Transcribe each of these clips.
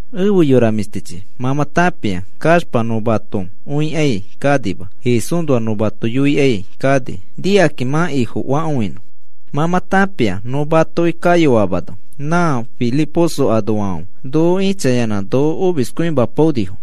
Efe yora mĩshtichi, mã mã tãpia kaxpa nõ mato õikai kanima. Jesúsnoa nõ mato yoikai kani nikakĩ mã Ifofakõinõ. Mã mã tãpia nõ matoki kayoamano na Filiposo anoafãfe noko ĩchayanã noko omiskõimapaonifo.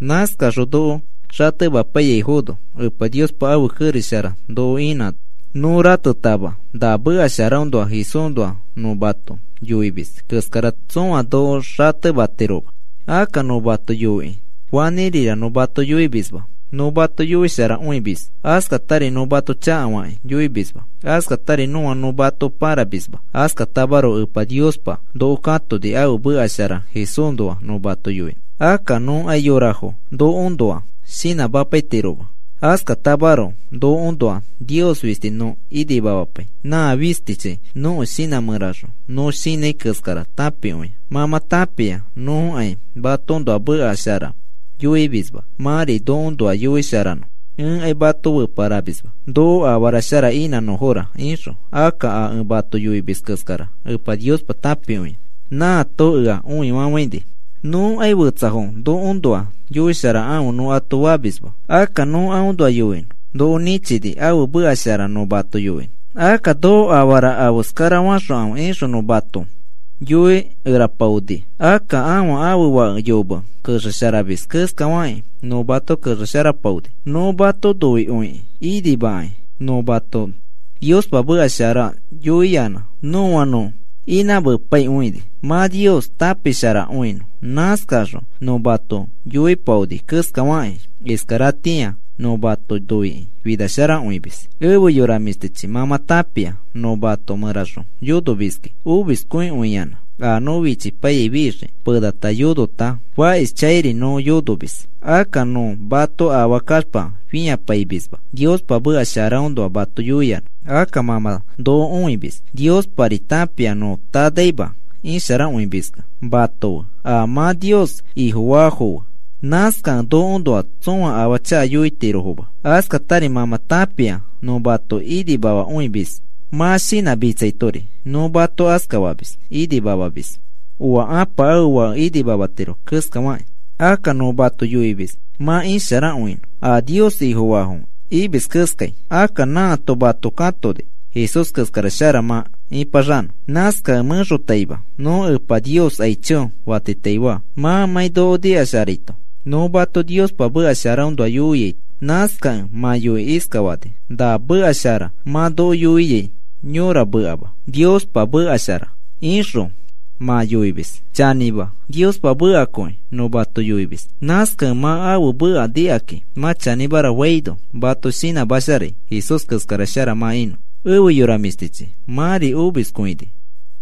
Nãskaxõ noko xatemapaiyaifono, Epa Niospa ãfe kerex shara noko inãno, nõ ratetama na meka sharaõnoa Jesúsnoa nõ mato yoimis keskara tsõa noko xatematiroma. Akka nõ mato yoiki fanĩrira nõ mato yoimisma, nõ mato yoisharakõimis. Askatari nõ mato chakafakĩ yoimisma, askatari nõa nõ mato paramisma. Askatamaroko Epa Niospa noko katoni ãfe meka shara Jesúsnoa nõ mato yoinõ. Akka nõkai yorafo nokoõnoa shinãmapaitiroma. Askatamaroko nokoõnoa Nios fisti nõ inimamapai, nã fistichi nõko shinã mẽraxõ nõ shinãi keskara tãpikõia. Mã mã tãpia nõkai matoõnoa meka shara yoimisma, mãri nokoõnoa yoisharanõ. Ẽkai mato feparamisma, “Noko afara shara inãnõfora,” ixõ. Akka a ẽ mato yoimis keskara Epa Niospa tãpikõia, nãato ea õifafaini. Nõkai fetsafo nokoõnoa yoisharakãfe nõ ato famisma. Akka nõ aõnoa yoinõ noko nĩchini ãfe meka shara nõ mato yoinõ. “Akka noko afara afeskarafaxokãfe,” ixõ nõ mato yoikerapaoni. Akka ãfa ãfe fake yome kexesharamis keskafaki nõ mato kexesharapaoni. Nõ mato noikõikĩ inimakãi nõ mato Niospa meka shara yoiyanã nõa nõ inãmepaikõini, mã Nios tãpisharakõinõ. Nãskaxõ nõ mato noipaoni keskafaki, iskaratĩa nõ mato noikĩ finasharakõimis. Efe yora mĩshtichi, mã mã tãpia nõ mato mẽraxõ yonomiski omiskõikõiyanã, a nõ fichipaiyai fixiki, penata yonota fakishchãiri nõ yonomis. Akka nõ mato afaa kaxpa fĩapaimisma, Niospa meka sharaõnoa mato yoiyanã. Akka mã mã noko õimis, Niospari tãpia nõ tanaima isharakõimiskẽ mato fe a mã Nios Ifofaafo fe. Nãskakẽ nokoõnoa tsõa afaa chaka yoitirofoma. Askatari mã mã tãpia nõ mato inimamakõimis, mã shinãmitsaitori nõ mato askafamis inimamamis oa ãpa ãfe fake inimamatiro keskafakĩ. Akka nõ mato yoimis mã isharakõinõ a Nios Ifofaafo imis keskai. Akka nãato mato katoni Jesús keskara shara mã ĩpaxanõ. Nãskakẽ mẽxotaima nõ Epa Nios aicho fatitaifaa mãmãi noko nikasharaito, nõ mato Niospa meka sharaõnoa yoiaito. Nãskakẽ mã yoikĩ iskafani: “Na meka shara mã noko yoiai yõra mekama, Niospa meka shara,” ixõ mã yoini. Chanĩma, Niospa mekakõi nõ mato yoimis. Nãskakẽ mã ãfe meka nikakĩ mã chanĩmara faino mato shinãmasharai Jesús keskara shara mã inõ. Efe yora mĩshtichi, mãri omiskõini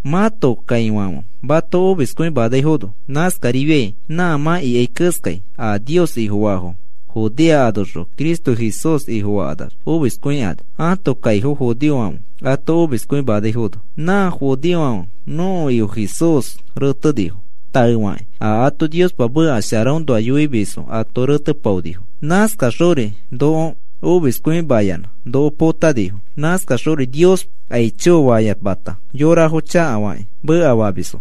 mãto kaifãfe mato omiskõimanaifono. Nãskarifiai nã mã ikai keskai a Nios Ifofaafo Judea anoxõ Cristo Jesús Ifofakanax omiskõikani ãto kaifo judeofãfe ato omiskõimanaifono. Nã judeofãfe nõko Ifo Jesús retenifo, taefakĩ a ato Niospa meka sharaõnoa yoimis ato retepaonifo, nãskaxori noko omiskõimayanã noko potanifo. Nãskaxori Nios aicho fayamata yorafo chakafakĩ mekafamisfo.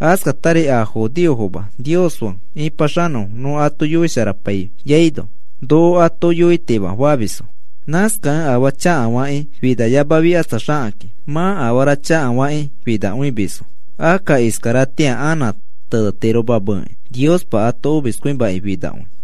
Askatari a judeofoma Nios fe ĩpaxanõfo nõ ato yoisharapaiyaino, noko ato yoitima famisfo. Nãskakẽ afaa chakafakĩ finayamafikatsaxakakĩ mã afara chakafakĩ finakõimisfo. Akka iskaratĩa anã tenetiromameki Niospa ato omiskõimaki finakõi.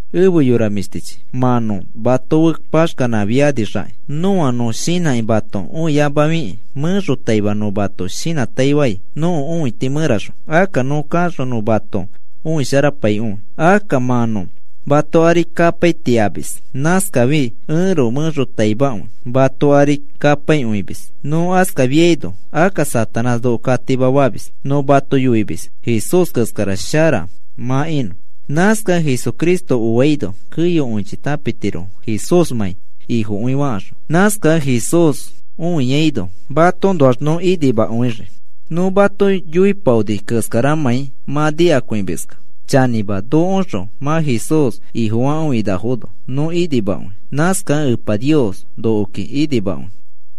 Efe yora mĩshtichi, mã nõ mato fe paxkanãifinixakĩ, nõa nõ shinãki mato õiamafikĩ mẽxotaima nõ mato shinãtaifai nõko õiti mẽraxõ. Akka nõ kaxõ nõ mato õisharapaikõi. Akka mã nõ mato ari kapaitaiamis, nãskaifi ẽroko mẽxotaimakõi mato ari kapaikõimis. Nõ askafiaino, akka Satanás noko katimafamis. Nõ mato yoimis Jesús keskara shara mã inõ. Nãskakẽ Jesucristo oaino keyokõichi tãpitirofo Jesúsmãi Ifokõi fakaxõ. Nãskakẽ Jesús õiaino matoõnoax nõ inimakõixii, nõ mato yoipaoni keskaramãi mã nikakõimiskẽ. Chanĩma, nokoõxõ mã Jesús Ifofakõinafono nõ inimakõi. Nãskakẽ Epa Nios nokoki inimakõi.